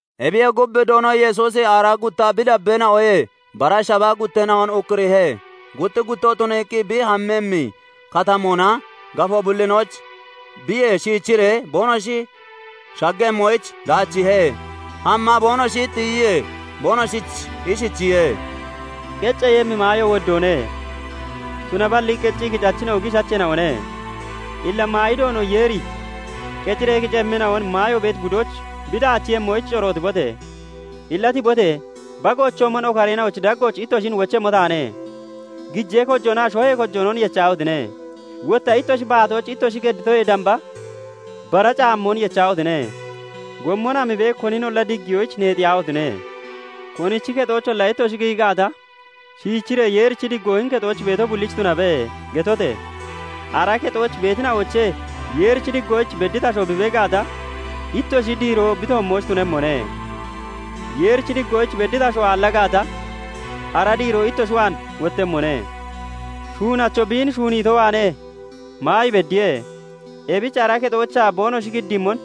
Ebiyee gub, Doono Yesuusi aaraa gutta bi dabbeena'oyee bara shabaa gutteena'on ukkuriihe; gutti guttoo tuniiqqi, bi hammemmi katamoonaa gafoo bullinooch biye shiichiree boonoshi shaggemmoyich daachiihe. Hamma boonoshi tiyiyee, boonoshich ishichiye:- "Qecceeyemmi maayo woddoone; tunaballi qeccii kicachina'o giishacheena'one. Illa maayi Doono Yeeri qeciree kicemmina'on maayo beeti budooch bi daachiiyemmoyich corootibote! Illa tibote! Bagoochoomon okareena'ochi daggooch ittoshin wochemmo taane. Gijee kojoonaa shohee kojoonon yechahotine! Wotta ittoshi baatooch ittoshi gedditoyee damba bara caammoon yechahotine! Gommon hamibee koninolla diggiyoyich neexiyaahotine! "Konichi kexoocholla ittoshi giyi gaata, shiichiree, 'Yeerichi diggoo hini kexooch beeto bullich tunabe!' getote! Ara kexooch beetina'oochee Yeerichi diggoyich bedditi asho bi bee gaata, ittoshi diiroo bi toommooch tunemmone; Yeerichi diggoyich bedditi asho aalla gaata, ara diiroo ittoshi waan wottemmone. Shuunacho biin shuuniito waanee maayi beddiye; ebich ara kexoochaa boonoshi giddiimmon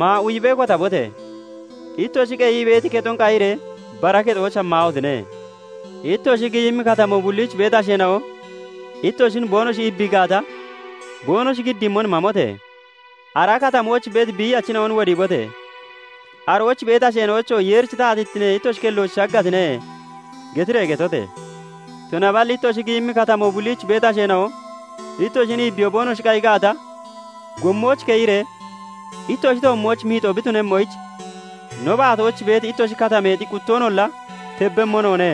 maa uyibee kotabote! Ittoshi qeyii beeti kexon qayiree bara kexooch hammaahotine! "Ittoshi giyimmi katamoo bulliich beeti asheena'o ittoshin boonoshi iibbii gaata, boonoshi giddiimmon mamote! Ara katamooch beeti biiyachina'on wodiibote! Arooch beeti asheena'oyichoo 'Yeerichi taatittine ittoshi kellooch shaggatine' getiree getote! Tunaballi ittoshi giyimmi katamoo bulliich beeti asheena'o ittoshin iibbiyoo boonoshi qayi gaata, gommooch keyiree, 'Ittoshi toommooch miixoo bi tunemmoyich, no baatooch beeti ittoshi katameexi quttoonolla tebbemmo noone;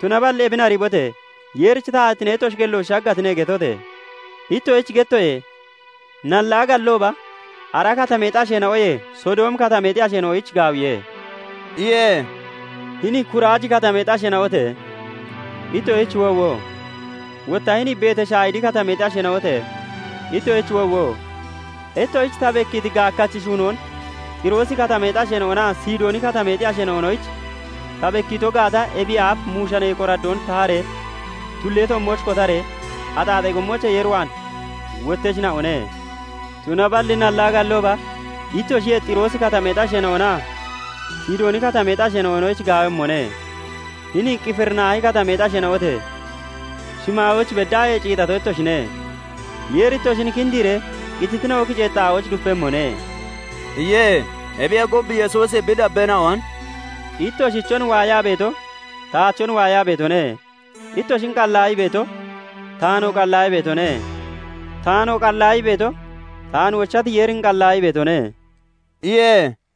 tunaballi ebin ariibote! Yeerichi taatittine ittoshi kelloch shaggatine' getote! Ittoshich gettoye; nallaa gallooba ara katameexi asheena'oyee Sodoomi Katameexi asheena'oyich gaawiye" iye. "Hini Kuraaji Katamee asheena'ote! Ittoshich woowo! Wotta hini Betashayidi Katamee asheena'ote! Ittoshich woowo! Ittoshich ta bekkiiti gaakkachi shuunoon Xiroosi Katamee asheena'onaa Sidooni Katamee asheena'onoyich ta bekkiito gaata, ebiyee aaf muushanee qoraddoon taharee, tullee toommooch kotaree, axaaxee gommoochee Yeer waan wotteshina'one. Tunaballi nallaa gallooba ittoshiyee Xiroosi Katameexi asheena'onaa Sidooni Katameexi asheena'onoyich gaawemmone. Hini Qifirinaahi Katamee asheena'ote! Shimaayooch beddaahee ciixato ittoshine; Yeeri ittoshin kindiiree qititina'o kiceeti xaa'ooch dupemmone" iye. Ebiyee gub, Yesuusi bi dabbeena'on "Ittoshichon waayaa beeto, taachon waayaa beetone; ittoshin qallaayii beeto, taanoo qallaayii beetone; taanoo qallaayii beeto, taan wochati Yeerin qallaayii beetone" iye.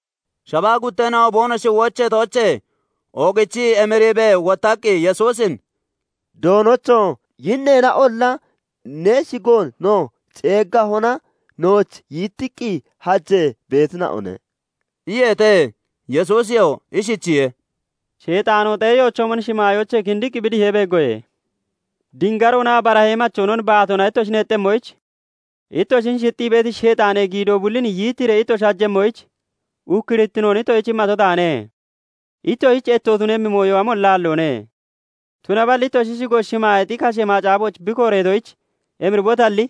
Shabaa gutteena'o boonoshi wocheetoochee oogichii emiibee wottaqqi, Yesuusin "Doonocho! Yinneena'olla ne shigoon no ceeggahona nooch yittiqqi hajee beetina'one" iyeete. Yesuusiyoo ishichiye:- "Sheexaanoo xeeyoochoomon shimaayoochee kindiqqi bi dihee beeggoye. Dingaroonaa barahee machoonon baatoona ittoshi neexxemmoyich, ittoshin shixxii beeti Sheexaanee giidoo bullin yittiiree ittoshi hajemmoyich, ukkurittinoon ittoshich immato taane. ittoshich etto tunemmi mooyo amolla aalloone. Tunaballi ittoshi shigo shimaayeexi kashee macaafooch bi kooreetoyich emiribotalli,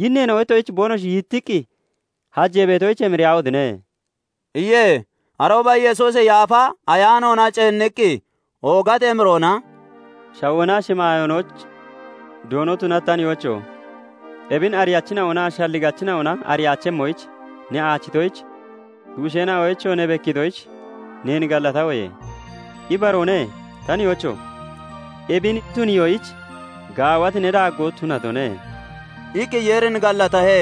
yinneena'o ittoshich boonoshi yittiqqi hajee beetoyich emiriyaahotine!" iye. Arooba Yesuusi Yaafa Ayaanoona ceenniqqi oogati emiroona "Shawoonaa shimaayoonochi Doono tunati ta nihoocho! Ebin ariyachina'onaa shalligachina'ona ariyaachemmoyich ne aachitoyich, tuusheena'oyichoo ne bekkiitoyich neen gallatahoye. Ibaroone, ta nihoocho! Ebin tuniyoyich gaawati ne daaggo tunatone" iqqi Yeerin gallatahe.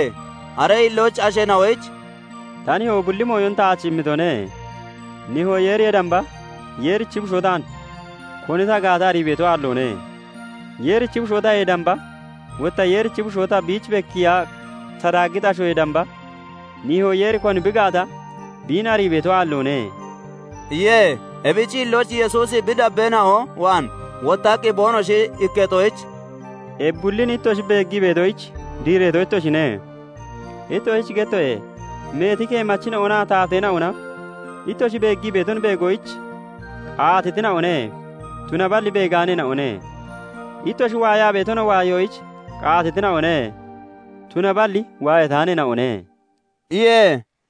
Aree hillooch asheena'oyich "Ta nihoo bulli mooyon taach immitone; nihoo Yeeriyee damba Yeerichi Bushoo taan koni ta gaata arii beeto aalloone. Yeerichi Bushoo tayee damba, wotta Yeerichi Bushoo ta biich bekkiiya ta daaggiti ashoyee damba, nihoo Yeeri koni bi gaata biin arii beeto aalloone" iye. Ebichi hillooch Yesuusi bi dabbeena'o waan wottaqqi boonoshi ikketoyich "Ebi bullin ittoshi beeggii beetoyich diireeto ittoshine. Ittoshich gettoye; meeti keemachina'onaa taateena'ona ittoshi beeggii beeton beegoyich qaatitina'one; tunaballi beegaaneena'one. Ittoshi waayaa beetonoo waayoyich qaatitina'one; tunaballi waayataaneena'one" iye.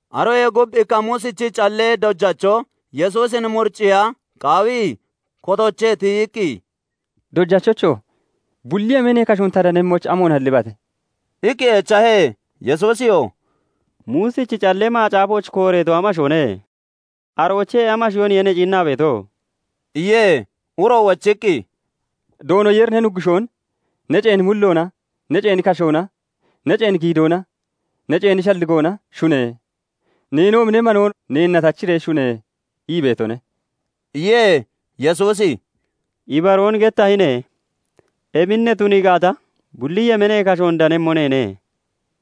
Aroyee gub ikka Muusichi callee dojacho Yesuusin muriciiya qaawii kotoochee tiyiqqi, "Dojachocho! Bulli yemeenee kashoon ta danemmoyich, amoon hallibate?" iqqi echahe. Yesuusiyoo "Muusichi Callee Macaafooch kooreeto amashoone? Aroochee amashooniye ne ciinnaa beeto?" iye. Uroo wochiqqi, " 'Doono Yeeri ne Nuggushoon ne ceeni mulloona, ne ceeni kashoona, ne ceeni giidoona, ne ceeni shalligoona shune! Neenoomi ne manoon neenna tachiree shune!' ii beetone" iye. Yesuusi "Ibaroon gettahine; ebin ne tunii gaata, bulli yemeenee kashoon danemmo neene"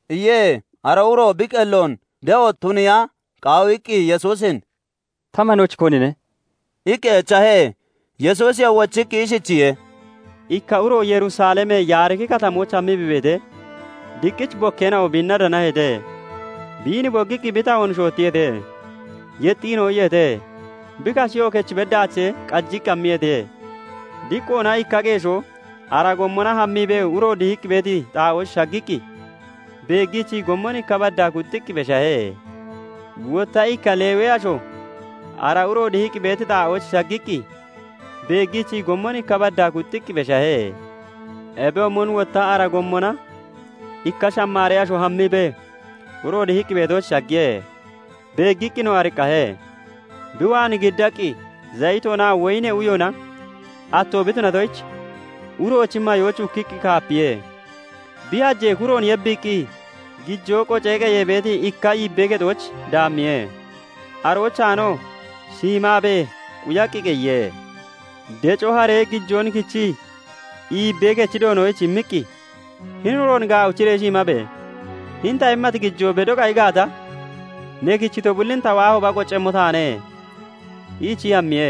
iye. Ara uroo bi qelloon de'o tuniiya qaawiqqi Yesuusin "Ta manochi konine?" iqqi echahe. Yesuusiyoo wochiqqi ishichiye:- "Ikka uro Yerusalemee Yaariki Katamooch hammii bi beetee, diqqich bokkeena'o biinna danaheete. Biin boggiqqi bi tahoon shoottiyeete; yexxiinoo iyeete; bi kasheyoo kechi bedaachee qajii hammiyeete. "Diqqoona ikka qeeshoo ara gommona hammiibee uro dihiqqi beeti xaa'ooch shaggiqqi beeggiichii gommon ikka baddaa kuxxiqqi beshahe. "Wotta ikka Lewee asho ara uro dihiqqi beeti xaa'ooch shaggiqqi beeggiichii gommon ikka baddaa kuxxiqqi beshahe. "Ebiyoomon wotta ara gommona ikka Shamaaree asho hammiibee uro dihiqqi beetooch shaggiye; beeggiqqinoo ariqqahe; bi waan giddaqqi Zayitoonaa woyinee uyoona atto bi tunatoyich, uroochi mayooch ukkiqqi kaapiye; bi hajee kuroon yebbiiqqi gijoo qocee qeyee beeti ikka iibbee kexooch daammiye; aroochaanoo shiimaabee quyaqqi qeyiye. Deco haree gijoon kichii iibbee kechi Doonoyich immiqqi, 'Hini uroon gaawichiree shiimabe! Hini ta immati gijoo bedo qayi gaata, ne kichito bullin ta wottahooba qoccemmo taane' iichii hammiye.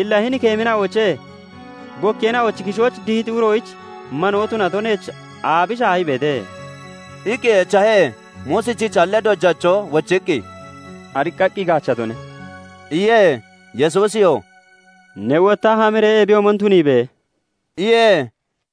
"Illa hini keemina'oochee bokkeena'ochi kishooch dihiti uroyich manoon tunato neech aabi shaahii beete?" iqqi echahe. Muusichi callee dojacho wochiqqi, "Ariqqaqqi gaachatone" iye. Yesuusiyoo "Ne wotta hamiree ebiyoomon tuniibe!" iye.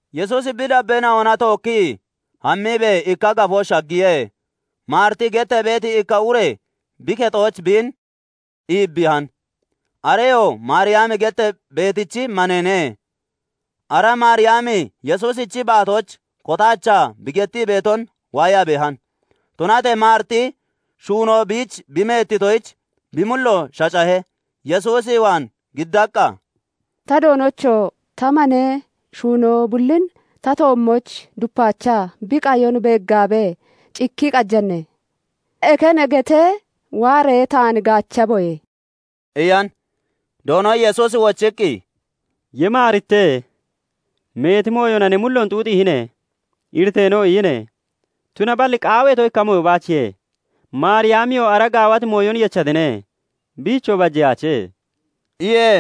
Yesuusi bi dabbeena'ona tookkii hammiibee ikka gafooch shaggiye; Maariti gettee beeti ikka ure bi kexooch biin iibbiihan. Areyoo Maariyami gettee beetichi maneene. Ara Maariyami Yesuusichi baatooch kotaachaa bi gettii beeton waayaa beehan. Tunatee Maariti shuunoo biich bi meettitoyich, bi mullo shacahe; Yesuus waan giddaqqa, "Ta Doonocho! Ta manee shuunoo bullin ta toommooch dupaachaa bi qayon beeggaabee, cikkii qajane? Eke ne getee, waaree taan gaachaboyee" iyan. Doono Yesuusi wochiqqi, "Ye Maarite! Meeti mooyona ne mulloon xuuxiihine; iriteenoo iyine. Tunaballi qaaweeto ikka mooyo baachiye; Maariyamiyoo ara gaawati mooyon yechatine; biichoo bajeyaache" iye.